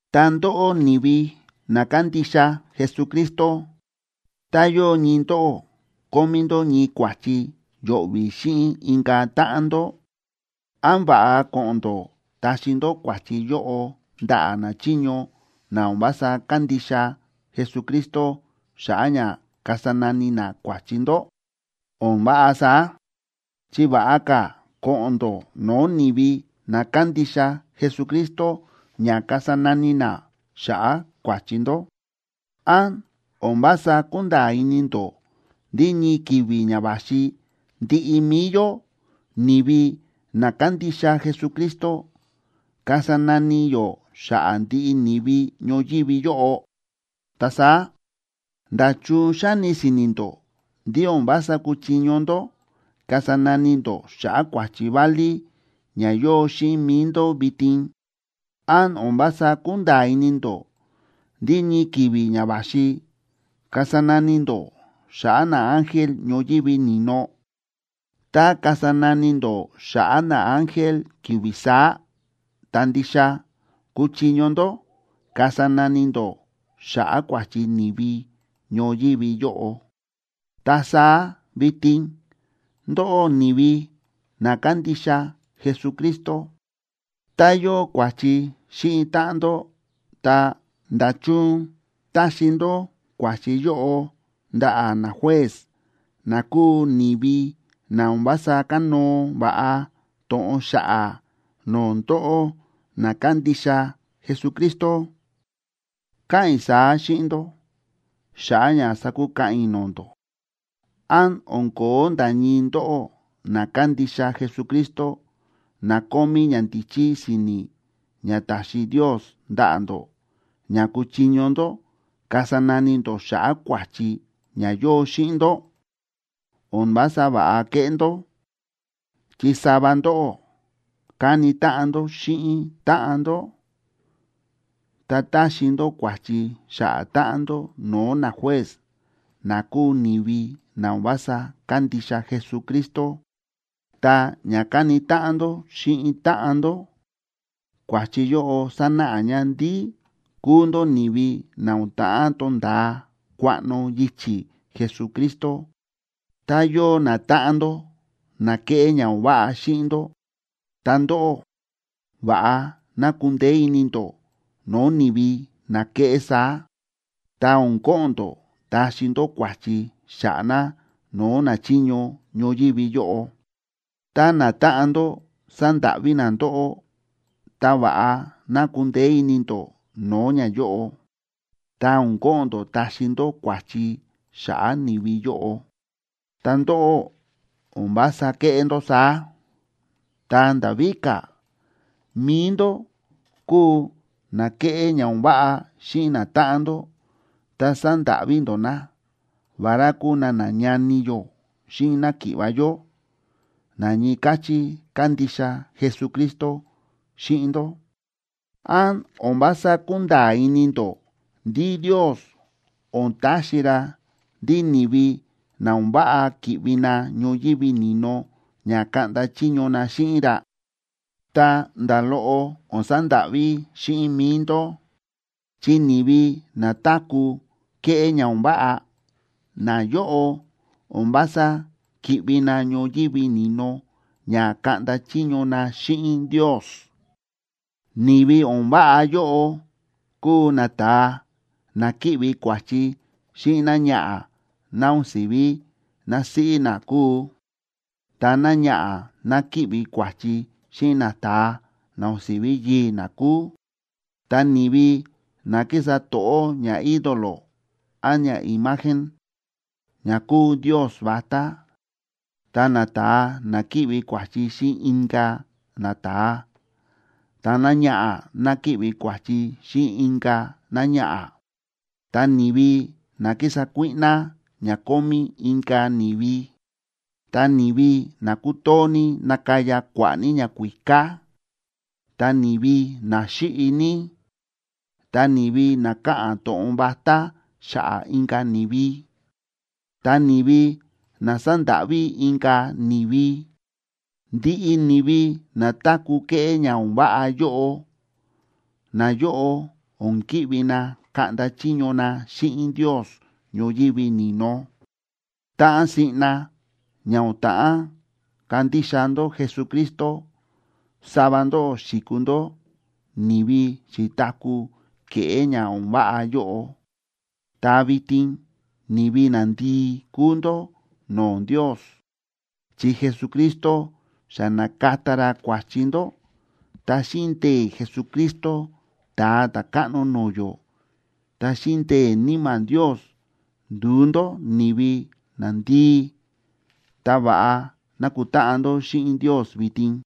Ta ndóꞌó ni̱vi na kándixa Jesucristo, tá yóo ñii ndóꞌó kómí ndó ñii kua̱chi yo̱ꞌvi̱ xíꞌin inka̱ táꞌan ndó, ¿án va̱ꞌa ko̱ꞌo̱n ndó taxi ndó kua̱chi yóꞌo ndaꞌa̱ nachiño na o̱n vása kándixa Jesucristo xa̱ꞌa̱ ña kasa nani na kua̱chi ndó? O̱n váꞌa saá, chi va̱ꞌa ka̱ ko̱ꞌo̱n ndó no̱o̱ ni̱vi na kándixa Jesucristo ña kasa nani na xa̱ꞌa̱ kua̱chi ndó. ¿Án o̱n vása kúnda̱a̱ ini ndó ndí ñii ki̱vi̱ ña va̱xi ndiꞌi mi̱i yó, ni̱vi na kándixa Jesucristo kasa nani yó xa̱ꞌa̱ ndiꞌi ni̱vi ñoyívi yóꞌo? Ta saá, ¿nda̱chun xáni si̱ni̱ ndó ndí o̱n vása kúchiño ndó kasa nani ndó xa̱ꞌa̱ kua̱chi válí ña yóo xíꞌin mi̱i ndó vitin? ¿Án o̱n vása kúnda̱a̱ ini ndó ndí ñii ki̱vi̱ ña va̱xi kasa nani ndó xa̱ꞌa̱ naángel ñoyívi ni̱no? Tá kasa nani ndó xa̱ꞌa̱ naángel ki̱vi̱ saá, ta ndixa kúchiño ndó kasa nani ndó xa̱ꞌa̱ kua̱chi ni̱vi ñoyívi yóꞌo. Ta saá vitin, ndóꞌó ni̱vi na kándixa Jesucristo, tá yóo kua̱chi xíꞌin táꞌan ndó, ta, ¿nda̱chun táxi ndó kua̱chi yóꞌo ndaꞌa̱ najuez na kúu ni̱vi na o̱n vása kánóo va̱ꞌa to̱ꞌon xa̱ꞌa̱ no̱o̱ ndóꞌó na kándixa Jesucristo? Káꞌa̱n i̱ saá xíꞌin ndó xa̱ꞌa̱ ña sakukaꞌan i̱ no̱o̱ ndó. ¿Án o̱n ko̱ó nda̱ ñii ndóꞌó na kándixa Jesucristo, na kómí ñandíchí si̱ni̱ ña ta̱xi Ndios ndaꞌa̱ ndó, ña kúchiño ndó kasa nani ndó xa̱ꞌa̱ kua̱chi ña yóo xíꞌin ndó? O̱n vása va̱ꞌa kéꞌé ndó, chi sava ndóꞌó káni táꞌan ndó xíꞌin táꞌan ndó, ta táxi ndó kua̱chi xa̱ꞌa̱ táꞌan ndó no̱o̱ najuez na kúu ni̱vi na o̱n vása kándixa Jesucristo. Ta ña káni táꞌan ndó xíꞌin táꞌan ndó, kua̱chi yóꞌo sánáꞌa ña ndí kúu ndó ni̱vi na o̱n ta̱ꞌán tonda̱a kuaꞌno yichi̱ Jesucristo. Tá yóo natáꞌan ndó na kéꞌé ña o̱n váꞌa xíꞌin ndó, ta ndóꞌó va̱ꞌa ná kundeé ini ndó no̱o̱ ni̱vi na kéꞌé saá, ta o̱n ko̱ꞌo̱n ndó taxi ndó kua̱chi xa̱ꞌa̱ na no̱o̱ nachiño ñoyívi yóꞌo. Tá natáꞌan ndó sándáꞌví na ndóꞌó, ta va̱ꞌa ná kundeé ini ndó no̱o̱ ñayóꞌo, ta o̱n ko̱ꞌo̱n ndó taxi ndó kua̱chi xa̱ꞌa̱ ni̱vi yóꞌo. Ta ndóꞌó o̱n vása kéꞌé ndó saá. Ta nda̱ víka̱, mi̱i ndó kúu na kéꞌé ña o̱n váꞌa xíꞌin natáꞌan ndó ta sándáꞌví ndó na, vará kúu na nañani yó xíꞌin náki̱ꞌva̱ yó, na ñii káchí kándixa Jesucristo xíꞌin ndó. ¿Án o̱n vása kúnda̱a̱ ini ndó ndí Ndios o̱n taxi ra ndí ni̱vi na o̱n váꞌa ki̱ꞌvi na ñoyívi ni̱no ña kaꞌnda chiño na xíꞌin ra? Ta nda̱ loꞌo o̱n sandáꞌví xíꞌin mi̱i ndó, chi ni̱vi na táku̱ kéꞌé ña o̱n váꞌa, nayóꞌo o̱n vása ki̱ꞌvi na ñoyívi ni̱no ña kaꞌnda chiño na xíꞌin Ndios. Ni̱vi o̱n váꞌa yóꞌo kúu nata̱a na kíꞌvi kua̱chi xíꞌin náñaꞌa̱ ná o̱n si̱ví násíꞌí na kúu, ta náñaꞌa̱ ná kíꞌvi kua̱chi xíꞌin nata̱a na o̱n si̱ví yii̱ ná kúu, ta ni̱vi na kísa to̱ꞌó ñaídolo án ñaimagen, ña kúu ndios vatá, ta nata̱a na kíꞌvi kua̱chi xíꞌin inka̱ nata̱a, ta náñaꞌa̱ ná kíꞌvi kua̱chi xíꞌin inka̱ náñaꞌa̱, ta ni̱vi na kísa kuíꞌná ña kómí inka̱ ni̱vi, ta ni̱vi na kútoo ní nakaya kua̱ꞌa̱ ní ñakuíká, ta ni̱vi na xíꞌi ní, ta ni̱vi na káꞌa̱n to̱ꞌon vatá xa̱ꞌa̱ inka̱ ni̱vi, ta ni̱vi na sándáꞌví inka̱ ni̱vi. Ndiꞌi ni̱vi na táku̱ kéꞌé ña o̱n váꞌa yóꞌo, nayóꞌo o̱n ki̱ꞌvi na kaꞌnda chiño na xíꞌin Ndios ñoyívi ni̱no. Táꞌan siꞌna ña o̱n ta̱ꞌán kandixa ndó Jesucristo, sava ndóꞌó xi̱kuu ndó ni̱vi xi̱taku̱ ke̱ꞌé ña o̱n váꞌa yóꞌo. Ta vitin ni̱vi nandii kúu ndó no̱o̱ Ndios, chi Jesucristo xa na̱kata ra kua̱chi ndó, ta xíꞌin ndee̱ Jesucristo Ta̱a Ta̱káꞌno no̱o̱ yó, ta xíꞌin ndee̱ Níma̱ Ndios, ndu̱u ndó ni̱vi nandii, ta va̱ꞌa nákutáꞌan ndó xíꞌin Ndios vitin.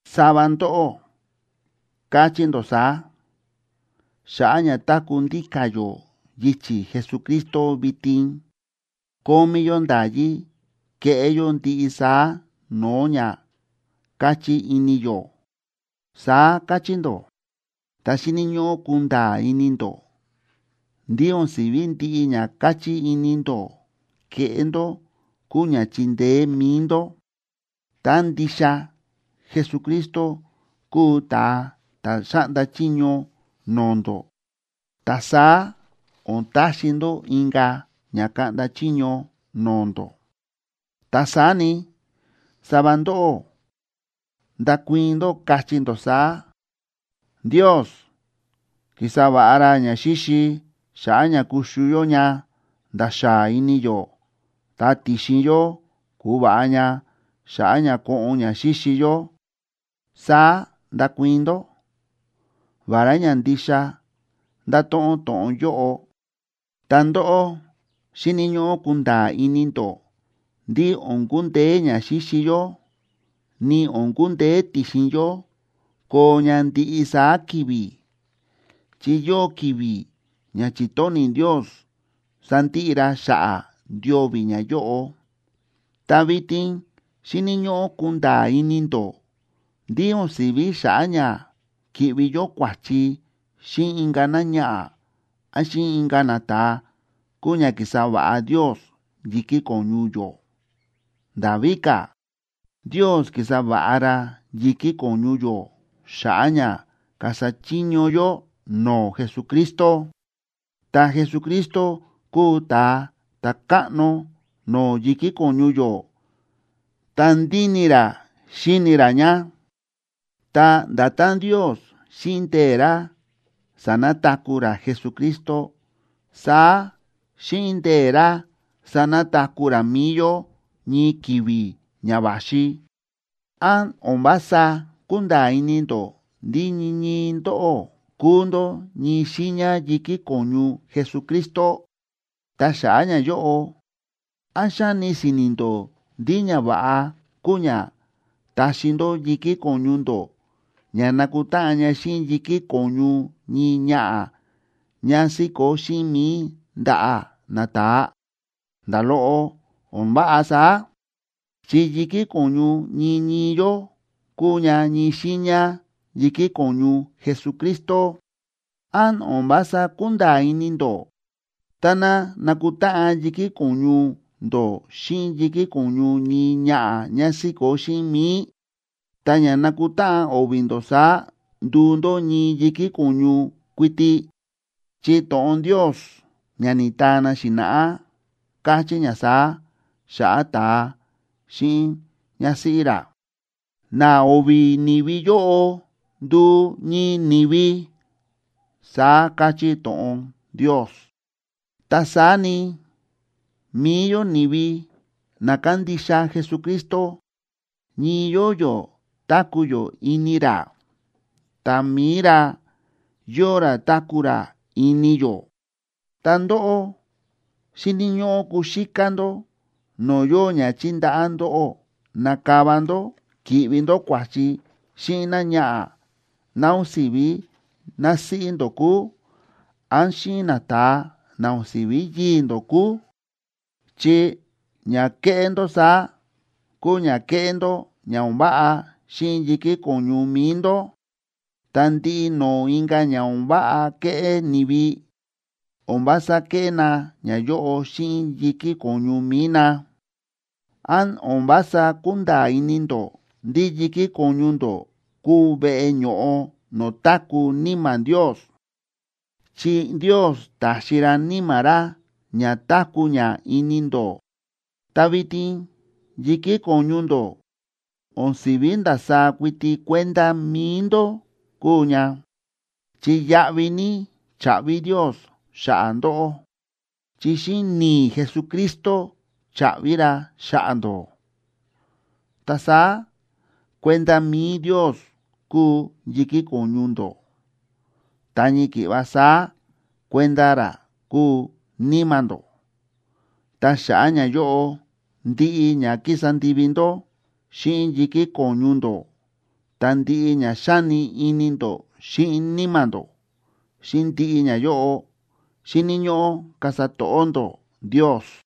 Sava ndóꞌó káchí ndó saá: “Xa̱ꞌa̱ ña táku̱ ndíka̱ yó yichi̱ Jesucristo vitin, kómí yó nda̱yí keꞌé yó ndiꞌi saá no̱o̱ ña káchí ini yó”, saá káchí ndó. Ta xíni̱ ñóꞌó kunda̱a̱ ini ndó ndí o̱n si̱ví ndiꞌi ña káchí ini ndó keꞌé ndó kúu ña chíndeé mi̱i ndó. Tá ndixa Jesucristo kúu ta̱a ta̱ xáꞌnda chiño no̱o̱ ndó, ta saá o̱n taxi ndó inka̱ ña kaꞌnda chiño no̱o̱ ndó. Ta saá ni, sava ndóꞌó ndakuii̱n ndó, kachí ndó saá: “Ndios ki̱sa va̱ꞌa ra ñaxíxi xa̱ꞌa̱ ña kuxu yó ña nda̱ xáa ini yó, ta ti̱xin yó ku̱va̱ꞌa ña xa̱ꞌa̱ ña koꞌon ña xíxi yó”, saá ndakuii̱n ndó. Vará ña ndixa ndáto̱ꞌon to̱ꞌon yóꞌo, ta ndóꞌó xíni̱ ñóꞌó kunda̱a̱ ini ndó ndí o̱n kundeé ña xíxi yó ni o̱n kundeé ti̱xin yó koo ña ndiꞌi saá ki̱vi̱, chi yóo ki̱vi̱ ña chi̱tóni̱ Ndios sandiꞌi ra xa̱ꞌa̱ ndio̱vi̱ ñayóꞌo. Ta vitin xíni̱ ñóꞌó kunda̱a̱ ini ndó ndí o̱n si̱ví xa̱ꞌa̱ ña ki̱ꞌvi yó kua̱chi xíꞌin inka̱ náñaꞌa̱ án xíꞌin inka̱ nata̱a kúu ña ki̱sa va̱ꞌa Ndios yi̱kí ko̱ñu yó. Nda̱ víka̱, Ndios ki̱sa va̱ꞌa ra yi̱kí ko̱ñu yó xa̱ꞌa̱ ña kasa chiño yó no̱o̱ Jesucristo. Ta Jesucristo kúu ta̱a ta̱káꞌno no̱o̱ yi̱kí ko̱ñu yó ta ndíni ra xíni ra ña. Ta nda̱tán Ndios xíꞌin ndee̱ ra sa̱nataku̱ ra Jesucristo, saá xíꞌin ndee̱ ra sanataku̱ ra mi̱i yó ñii ki̱vi̱ ña va̱xi. ¿Án o̱n vása kúnda̱a̱ ini ndó ndí ñii ñii ndóꞌó kúu ndó ñii xiiña yi̱kí ko̱ñu Jesucristo? Ta xa̱ꞌa̱ ñayóꞌo, ¿án xáni si̱ni̱ ndó ndí ñava̱ꞌa kúu ña taxi ndó yi̱kí ko̱ñu ndó ña nakutáꞌan ña xíꞌin yi̱kí ko̱ñu ñii ñaꞌa̱ ñá síkó xíꞌin mi̱i ndaꞌa̱ nata̱a? Nda̱ loꞌo o̱n váꞌa saá, chi yi̱kí ko̱ñu ñii ñii yó kúu ña ñii xiiña yi̱kí ko̱ñu Jesucristo. ¿Án o̱n vása kúnda̱a̱ ini ndó táná nakutáꞌan yi̱kí ko̱ñu ndó xíꞌin yi̱kí ko̱ñu ñii ñaꞌa̱ ñá síkó xíꞌin mi̱i, ta ña nakutáꞌan o̱vi̱ ndó saá nduu ndó ñii yi̱kí ko̱ñu kuiti? Chi to̱ꞌon Ndios ña ni̱taa na xi̱na̱ꞌá káchí ña saá xa̱ꞌa̱ ta̱a xíꞌin ñásíꞌí ra: “Na o̱vi̱ ni̱vi yóꞌo nduu ñii ni̱vi”, saá káchí to̱ꞌon Ndios. Ta saá ni, mi̱i yó ni̱vi na kándixa Jesucristo, ñii yóo yó táku̱ yó ini ra, ta mi̱i ra yóo ra táku̱ ra ini yó. Ta ndóꞌó, xíni̱ ñóꞌó kuxíká ndó no̱o̱ yóo ña chíndaꞌá ndóꞌó nakava ndó ki̱ꞌvi ndó kua̱chi xíꞌin náñaꞌa̱ ná o̱n si̱ví násíꞌí ndó kúu, án xíꞌin nata̱a na o̱n si̱ví yii̱ ndó kúu, chi ña kéꞌé ndó saá kúu ña kéꞌé ndó ña o̱n váꞌa xíꞌin yi̱kí ko̱ñu mi̱i ndó. Ta ndiꞌi no̱o̱ inka̱ ña o̱n váꞌa kéꞌé ni̱vi, o̱n vása kéꞌé na ñayóꞌo xíꞌin yi̱kí ko̱ñu mi̱i na. ¿Án o̱n vása kúnda̱a̱ ini ndó ndí yi̱kí ko̱ñu ndó kúu veꞌe ño̱ꞌo no̱o̱ táku̱ Níma̱ Ndios?, chi Ndios ta̱xi ra Níma̱ ra ña táku̱ ña ini ndó. Ta vitin yi̱kí ko̱ñu ndó o̱n si̱ví ndasaá kuiti kuenda mi̱i ndó kúu ña, chi yáꞌví ní cha̱ꞌvi Ndios xa̱ꞌa̱ ndóꞌó, chi xíꞌin ni̱i̱ Jesucristo cha̱ꞌvi ra xa̱ꞌa̱ ndóꞌó. Ta saá kuenda mi̱i Ndios kúu yi̱kí ko̱ñu ndó, ta ñii ki̱ꞌva saá kuenda ra kúu níma̱ ndó. Ta xa̱ꞌa̱ ñayóꞌo, ndiꞌi ña kísa ndivi ndó xíꞌin yi̱kí ko̱ñu ndó, ta ndiꞌi ña xáni ini ndó xíꞌin níma̱ ndó, xíꞌin ndiꞌi ñayóꞌo xíni̱ ñóꞌó kasa to̱ꞌó ndó Ndios.